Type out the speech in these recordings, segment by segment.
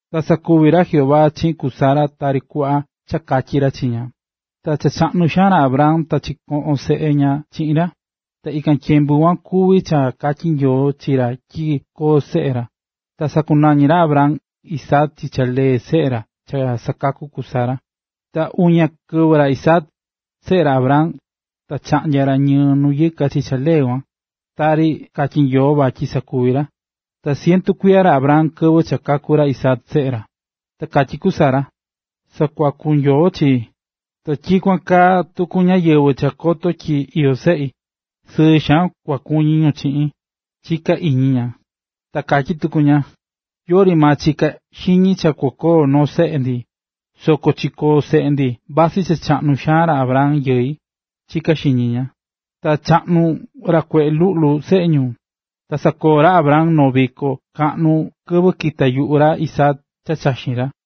Ta sakuvi̱ ra Jehová chiꞌin ku Sara tari kuꞌva cha katyi̱ ra chi ña. Ta cha chaꞌnu xaan ra Abraham ta chikoꞌo̱n seꞌe ña chiꞌin ra. Ta ikan tyembu kuan kuví cha katyi̱ Nyoo chi ra tyi koo seꞌe ra. Ta sakunañi̱ ra Abraham Isaac chi cha lee seꞌe ra cha sakaku̱ ku Sara. Ta uña kɨvɨ ra Isaac, seꞌe ra Abraham, ta chaꞌnya̱ ra ñɨɨ nu yɨka chi cha lee kuan, tari katyi̱ Nyoo vatyi sakuvi ra. Ta cientu kuiya ra Abraham kɨvɨ cha kaku̱ ra Isaac, seꞌe ra. Ta katyí ku Sara: “Sakuaku̱ Nyoo chii, ta tyikuan kaa tuku ñáyɨvɨ cha koto tyi iyó seꞌi, sɨɨ xaan kua kuñi ñu chiꞌin”, chiká iñi ña. Ta katyí tuku ña: “Yori maa chika̱ xiñi cha kukoo noo seꞌe ndi, soko chikoo̱ seꞌe ndi vasɨ cha chaꞌnu xaan ra Abraham yɨi”, chiká xiñi ña. Ta chaꞌnu ra kueꞌe luꞌlu seꞌe ñu, ta sakoo̱ ra Abraham noo viko kaꞌnu kɨvɨ kita̱ yuꞌu ra Isaac cha chaxín ra.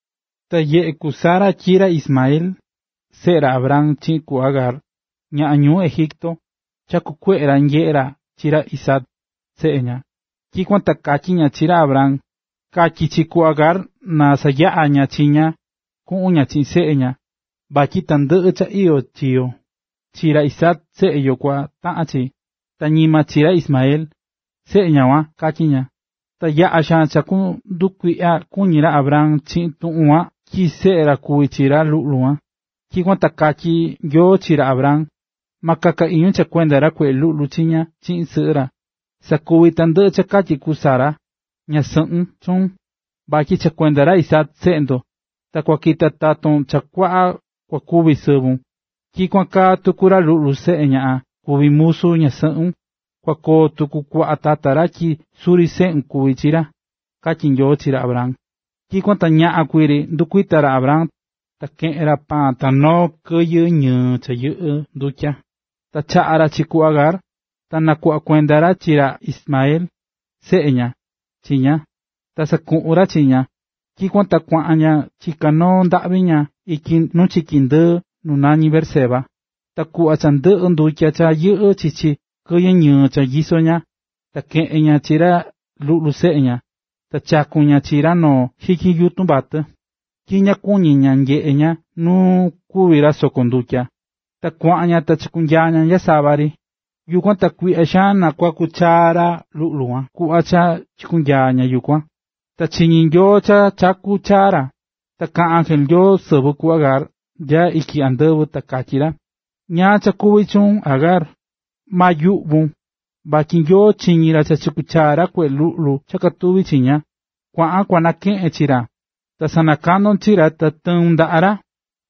Ta nyeꞌe̱ ku Sara tyi ra Ismael, seꞌe ra Abraham chiꞌin ku Agar, ñaꞌan ñuu Egipto, chakú kueꞌe ra nyeꞌé ra chi ra Isaac, seꞌe ña. Tyikuan ta katyí ña chi ra Abraham: “Ka̱tyi chi ku Agar na sayaꞌa ña chi ña, kuꞌun ña chiꞌin seꞌe ña, vatyi tandɨꞌɨ cha iyó chi yo, chi ra Isaac, seꞌe yo, kutaꞌan chi, ta ñima chi ra Ismael, seꞌe ñaꞌan kuan”, katyí ña. Ta yaꞌa̱ xaan cha ndukuiꞌya kuñi̱ ra Abraham chiꞌin tuꞌun kuan tyi seꞌe ra kuví chi ra luꞌlu kuan. Tyikuan ta katyí Nyoo chi ra Abraham: “Ma kaka iñun cha kuenda ra luꞌlu chiña chiꞌin sɨꞌɨ ra. Sa̱kuvi tandɨꞌɨ cha katyí ku Sara, ñasɨꞌɨ chuun, vatyi cha kuenda ra Isaac, seꞌe ndo, ta kua kita taton cha kua kuiso sɨvun. Tyikuan kaa tuku ra luꞌlu, seꞌe ñaꞌan kuví musu ñasɨꞌun, kua koo tuku kuaꞌa tata ra tyi suri seꞌun kuví chi ra”, katyí Nyoo chi ra Abraham. Tyikuan ta ñaꞌan kuii ri ndɨkuita̱ ra Abraham, ta keꞌe̱n ra paan ta noo kɨyɨ ñɨɨ cha yɨꞌɨ́ ndutya, ta chaꞌa̱ ra chi ku Agar, ta nakuꞌva̱ kuenda ra chi ra Ismael, seꞌe ña, chi ña, ta sakuꞌu̱n ra chi ña. Tyikuan ta kuaꞌan ña chiká noo ndaꞌvi ña ityi nu chiki ndɨɨ nu nañí Beerseba. Ta kuꞌva cha ndɨꞌɨ̱ ndutya cha yɨꞌɨ́ chichi kɨyɨ ñɨɨ cha nyisó ña, ta keꞌe̱n ña chi ra luꞌlu seꞌe ña, ta chaku̱n ña chi ra noo xityin yutun vatɨ, tyi ña kuñi̱ ña nyeꞌe ña nu kúvi ra soko ndutya. Ta kuaꞌan ña ta chikunyaa̱ ña nya sava ri. Yukuan ta kuiꞌya xaan nakuaku̱ chaa ra luꞌlu kuan kuꞌva cha chikunyaa̱ ña yukuan. Ta chiñi̱ Nyoo cha chakú chaa ra. Ta nakaꞌa̱n ángel Nyoo sɨvɨ ku Agar nya ityi andɨvɨ, ta katyí ra: “¿Ñáá cha kuví chuun, Agar? Ma yuꞌvun, vatyi Nyoo chiñi̱ ra cha chakú ra luꞌlu nu katuví ra chiña. Kua̱ꞌan kua nakeꞌen chi ra, ta sanakandon chi ra ta tɨun ndaꞌa ra,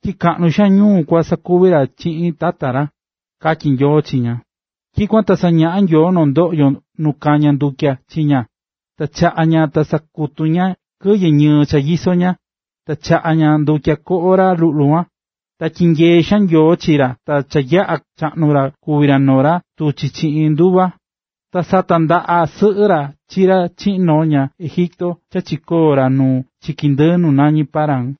tyi kaꞌnu xaan ñuu kua sakuvi chiꞌin tata ra”, katyí Nyoo chi ña. Tyikuan ta sañaꞌa̱ Nyoo noo ndoꞌyo nu kañá ndutya chi ña, ta chaꞌa̱n ña ta sakutu̱ ña kɨyɨ ñɨɨ cha nyisó ña, ta chaꞌa̱ ña ndutya koꞌo ra luꞌlu kuan. Ta tyinyee xaan Nyoo chi ra ta cha yaꞌa̱ chaꞌnu̱ ra kuvi̱ ra noo ra tuchí chiꞌin nduva. Ta satandaꞌa̱ sɨꞌɨ ra chi ra chiꞌin noo ñaꞌan Egipto ta chikoo̱ ra nu chiki ndɨɨ nu nañí Parán.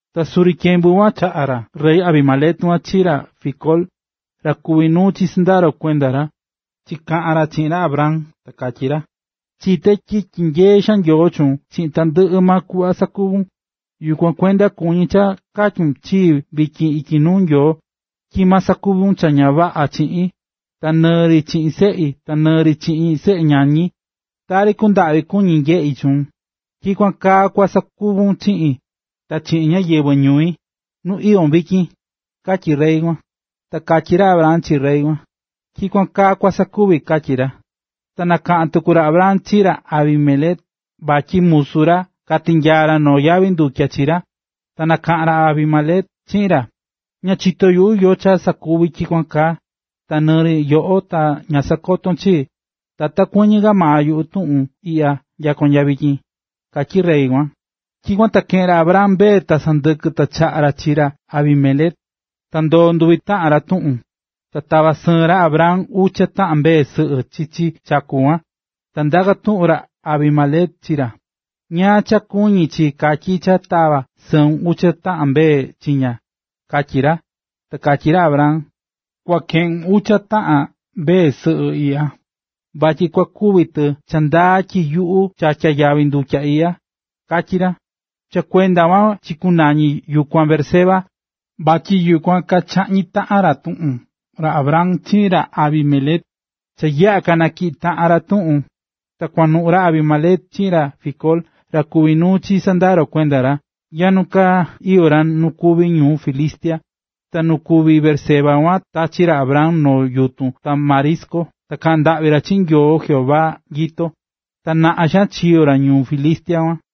Ta suri tyembu kuan, chaꞌa̱n ra rey Abimelec chiꞌin ra Ficol, ra kuví nuu chi sɨndaro kuenda ra, chikaꞌa̱n ra chiꞌin ra Abraham ta katyí ra: ―Chité tyi tyinyeé xaan Nyoo chuun chiꞌin tandɨꞌɨ maa kuꞌva sakuvún. Yukuan kuenda kuñí cha katyun chii vityin ityi nuu Nyoo, tyi ma sakuvun cha ña vaꞌa chiꞌin, ta nɨɨ ri chiꞌin seꞌi ta nɨɨ ri chiꞌin seꞌe ñañi. Tari kundaꞌvi kuñi̱ nyeꞌi̱ chuun, tyikuan kaa kua sakuvun chiꞌin, ta chiꞌin ñáyɨvɨ ñui, nu iyón vityin ―katyí rey kuan. Ta katyí ra Abraham chi rey kuan: ―Tyikuan kaa kua sakuvi ―katyí ra. Ta nakatyi̱ tuku ra Abraham chi ra Abimelec vatyi musu ra katinyaa̱ ra noo yavi ndutya chi ra. Ta nakaꞌa̱n ra Abimelec chiꞌin ra: ―Ña chitó yuꞌu yóó cha sakuvi̱ tyikuan kaa, ta nɨɨ ri yoꞌo ta ña sakoto̱n chii, ta ta kuɨñɨ ka maa yuꞌu tuꞌun iꞌya nya vityin ―katyí rey kuan. Tyikuan ta keꞌe̱n ra Abraham mbee ta sɨndɨkɨ ta chaꞌa̱ ra chi ra Abimelec, ta ndoo̱ nduvi taꞌan ra tuꞌun. Ta tava̱ sɨɨn ra Abraham ucha taꞌan mbee sɨꞌɨ chichi chaku kuan. Ta ndaka̱ tuꞌun ra Abimelec chi ra: ―¿Ñáá cha kuñí chi katyí cha tava̱ sɨun ucha taꞌan mbee chiña? ―katyí ra. Ta katyí ra Abraham: ―Kua keꞌun ucha taꞌan mbee sɨꞌɨ iꞌya, vatyi kua kuvi tɨ cha ndaa tyi yuꞌu chatya̱ yavi ndutya iꞌya ―katyí ra. Cha kuenda kuan chikunañi̱ yukuan Beerseba, vatyi yukuan kachaꞌñi̱ taꞌan ra tuꞌun ra Abraham chiꞌin ra Abimelec. Cha yaꞌa̱ kanatyiꞌi̱ taꞌan ra tuꞌun, ta kuanuꞌu̱ ra Abimelec chiꞌin ra Ficol, ra kuví nuu chi sɨndaro kuenda ra, nya nu ka iyó ra nu kuví ñuꞌún Filistia. Ta nu kuví Beerseba kuan tachi̱ ra Abraham noo yutun tamarisco ta kaꞌa̱n ndaꞌvi ra chiꞌin ra Jehová Nyoo nyito. Ta naꞌan xaan chiyo̱ ra ñuꞌún Filistia kuan.